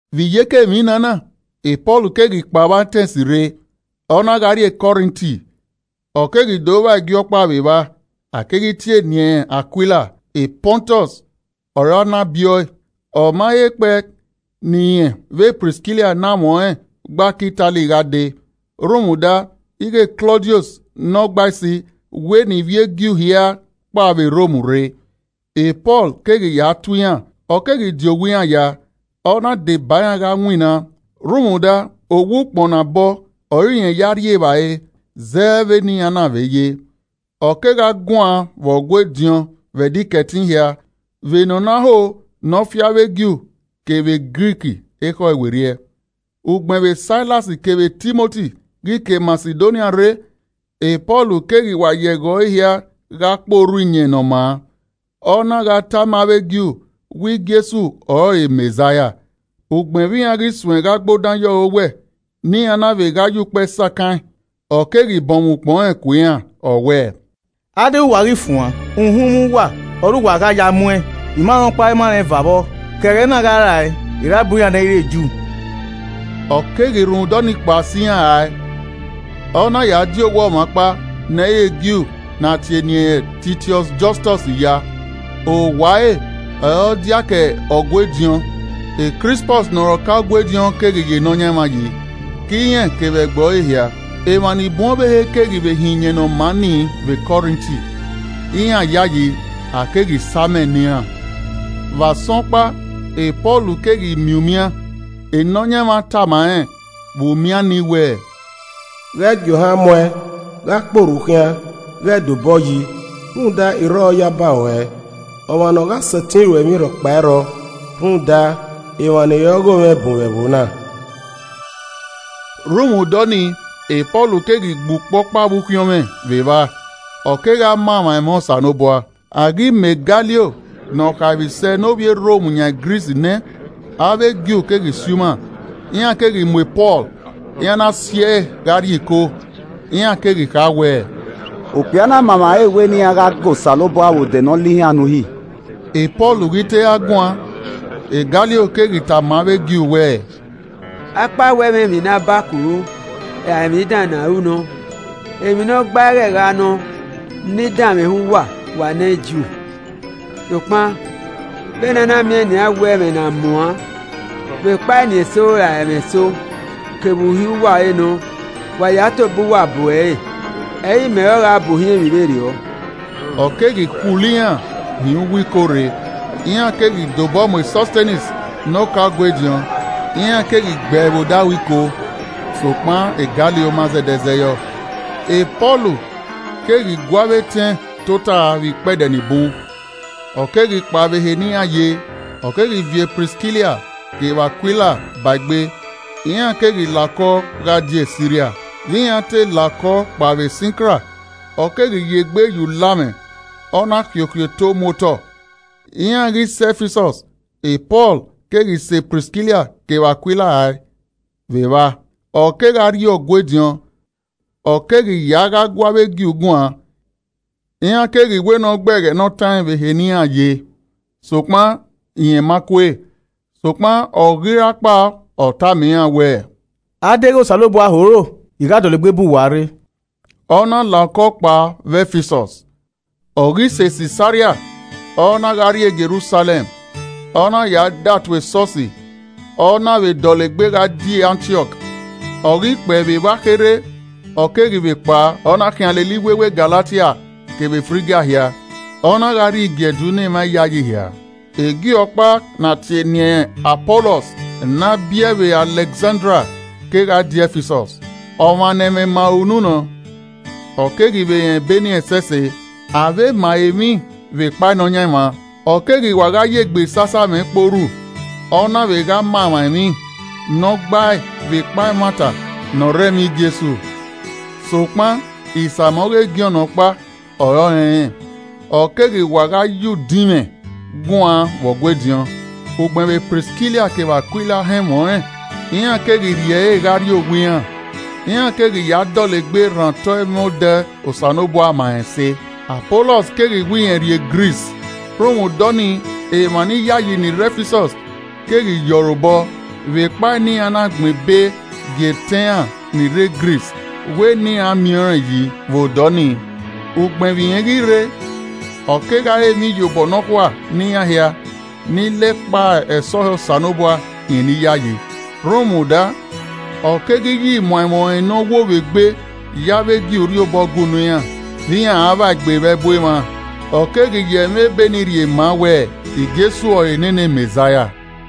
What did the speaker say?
Vbe iyeke emwi na na, Pọl keghi kpao vbe Atẹns rre, ọ na gha rrie Kọrinti. Ọ keghi do vba e Ju ọkpa vbe evba, a keghi tie eni ẹnrẹn Akuila, Pọntus ọre a na biẹ ọe, ọ ma he kpẹe ne irẹn vbe Priskila ne amwẹ ọnrẹn gba ke Itali gha dee, rhunmwuda ighẹ Klọdiọs ne Ọgbaisi wẹ ne ivbi e Ju hia kpao vbe Rom rre. Pọl keghi ya tuẹ iran. Ọ keghi di owa iran ya, ọ na deba iran gha winna, rhunmwuda owa ukpọn ne a bọ ọre irẹn ya rri evbare zẹ vbe ne iran na vbe ye. Ọ kegha guan vbe Ọgua ediọn vbe Ẹdẹ Ikẹtin hia vbe ne ọ na ho nọ fi avbe Ju kevbe Grik ekhọe werriẹ. Ugbẹn vbe Sailas kevbe Timoti ghi ke Masidonia rre, Pọl keghi wa ya ẹghẹ ọre hia gha kpe orhu iyẹn ne ọ maa, ọ na gha tama avbe Ju wẹ Jesu ọrọre Mẹzaia. Ugbẹn vbe iran ghi suẹn gha gbe odan ye ọre owẹ, ne iran na vbe gha ya ukpẹ sakan ẹn, ọ keghi bọnmwẹ ukpọn rẹn ku iran ọ wẹẹ, “A deghẹ wa ghi fuan, uhunmwu uwa ọre uwa gha ya muẹn, I ma rẹn ọkpa I ma rẹn eva vbọ. Ke ẹghẹ na gha rae, I ra bu iran ne ẹ i re Ju.” Ọ keghi rhunmwuda ọnii kpao sẹ iran rae, ọ na ya di owa ọmwa ọkpa ne ẹ i re Ju ne a tie eni ẹnrẹn Titiọs Jọstọs ya. Owa ẹre ọre ọ diake Ọgua ediọn. Krispọs ne ọre ọka Ọgua ediọn keghi ya Nọyaẹnmwa yi, ke irẹn kevbe ẹgbẹe ọre hia. Emwa ni bun ọvbehe keghi vbe họn iyẹn ne ọ maa ni vbe Kọrinti, iran yayi, a keghi sa amẹ ne iran. Vbe asọn ọkpa, Pọl keghi miẹn umian, Nọyaẹnmwa tama rẹn vbe umian ni wẹẹ, “Ghẹ gie ohan muẹn, gha kpe orhu khian, ghẹ da obọ yi. rhunmwuda, I rrọọ yaba ruẹ. Ọmwa ne ọ gha sẹtin ruẹ emwi rhọkpa ẹ i rrọọ, rhunmwuda emwa ni re ọghomwẹ bun vbe ẹvbo na.” Rhunmwuda ọnii, Pọl keghi gbe ukpo ọkpa vbe ukhiọnmwẹ vbe evba, ọ kegha ma emwa ẹmwẹ Osanobua. A ghi ma Galio ne ọ khaemwisẹ ne ovbi e Rom yan Gris nẹ, avbe Ju keghi si uma, iran keghi mu Pọl, iran na si ẹe gha rrie iko. Iran keghi kha wẹ, “Okpia na ma emwa ẹre wẹ ne iran gha ga Osanobua vbe odẹ ne ọ lihan ne uhi.” Pọl ghi te ra guan, Galio keghi tama avbe Ju wẹẹ, “Akpawẹ ẹmwẹ emwi ne a bakuru, ra emwi dan ne a ru nọ, emwi ne ọgbae ghẹ gha nọ ne I danmwehọ uwa, wa ne Ju. Sokpan vbe ne a na miẹn nian wẹ ẹmwẹ ne a muan vbe ekpa eni eso ra ẹmwẹ eso kevbe uhi uwa ọre nọ, wa ya tobọ uwa bu ẹre, ẹ i re imẹ ọre ọ gha bu ohiẹn emwi vberriọ.” Ọ keghi khulo iran hin uwu iko rre. Iran keghi de obọ mu Sọstenes ne ọka Ọgua ediọn iran keghi gbe ẹe vbe odaro iko. Sokpan Galio ma zẹdẹ zẹ yọ. Pọl keghi gu avbe etẹn tota vbe ikpẹdẹ ni bun, ọ keghi kpao vbe ehe ne iran ye, ọ keghi viọ Priskila kevbe Akuila ba egbe, iran keghi la okọ gha die Siria. Vbe iran te la okọ kpao vbe Sinkra, ọ keghi ye egbe ye ulamwẹ, ọ na khiokhio eto mu otọ. Iran ghi sẹ Ẹfisọs, Pọl keghi sẹ Priskila kevbe Akuila rae vbe evba, ọ kegha rrie Ọgua ediọn, ọ keghi ya gha gu avbe Ju guan. Iran keghi wẹ ne ọ gbe ẹghẹ ne ọ taẹn vbe ehe ne iran ye, sokpan rẹn ma kue. Sokpan, ọ ghi ra kpao ọ tama iran wẹ, “A deghẹ Osanobua ho ro, I gha dọlegbe bu uwa rre,” ọ na la okọ kpao vbe Ẹfisọs. Ọ ghi sẹ Sisaria, ọ na gha rrie Jerusalẹm, ọ na ya datuẹ esọsi, ọ na vbe dọlegbe gha die Antiọk, Ọ ghi kpẹe vbe evba kherhe, ọ keghi vbe kpao, ọ na khian lele iwewe Galatia kevbe Frigia hia, ọ na gha rhie igiẹdu ne emwa iyayi hia. E Ju ọkpa ne a tie eni ẹnrẹn Apọlọs, ne a biẹe vbe Alẹkzandria kegha die Ẹfisọs. Ọmwa ne ẹmwẹ ma ẹre unu nọ, ọ keghi vbe rẹn Ebe ni ẹsẹse. Avbe ma ẹre emwi vbe ekpa Nọyaẹnmwa, ọ keghi wa gha ya egbesasamwẹ kpe orhu, ọ na vbe gha ma emwa emwi ne ọ gbae vbekpa ẹmwata ne ọ rre ẹmwẹ Jesu. Sokpan isamẹ ọghe Jọn ọkpa ọre ọ rẹnrẹn. Ọ keghi wa gha ya udinmwẹ guan vbe Ọgua ediọn. Ugbẹn vbe Priskila kevbe Akuila họn ẹmwẹ ọnrẹn, iran keghi rhie ẹre gha rrie owa iran, iran keghi ya dọlegbe rhan otọ ẹmwẹ odẹ Osanobua ma rẹn ẹse. Apọlọs keghi wẹ rẹn rrie Gris, rhunmwuda ọnii, emwa niyayi ni rre Ẹfisọs keghi ye ọre obọ vbekpa ne iran na gbẹn ebe gie etẹn iran ni rre Gris wẹ ne iran miẹn rẹn yi vbe odọ ni. Ugbẹn vbe irẹn ghi rre, ọ kegha re emwi iyobọ nọkhua ne iran hia ni la ekpa ẹsọhẹ Osanobua khian eniyayi. Rhunmwuda, ọ keghi ya imuan ẹmwẹ ọnrẹn ne ọ wo vbe egbe ya avbe Ju rhie obọ gue unu iran, vbe iran a vba egbe vbe ẹbu emwa, ọ keghi ya ẹmwẹ Ebe ni rhie ma wẹ, Jesu ọrọre nene Mẹzaia.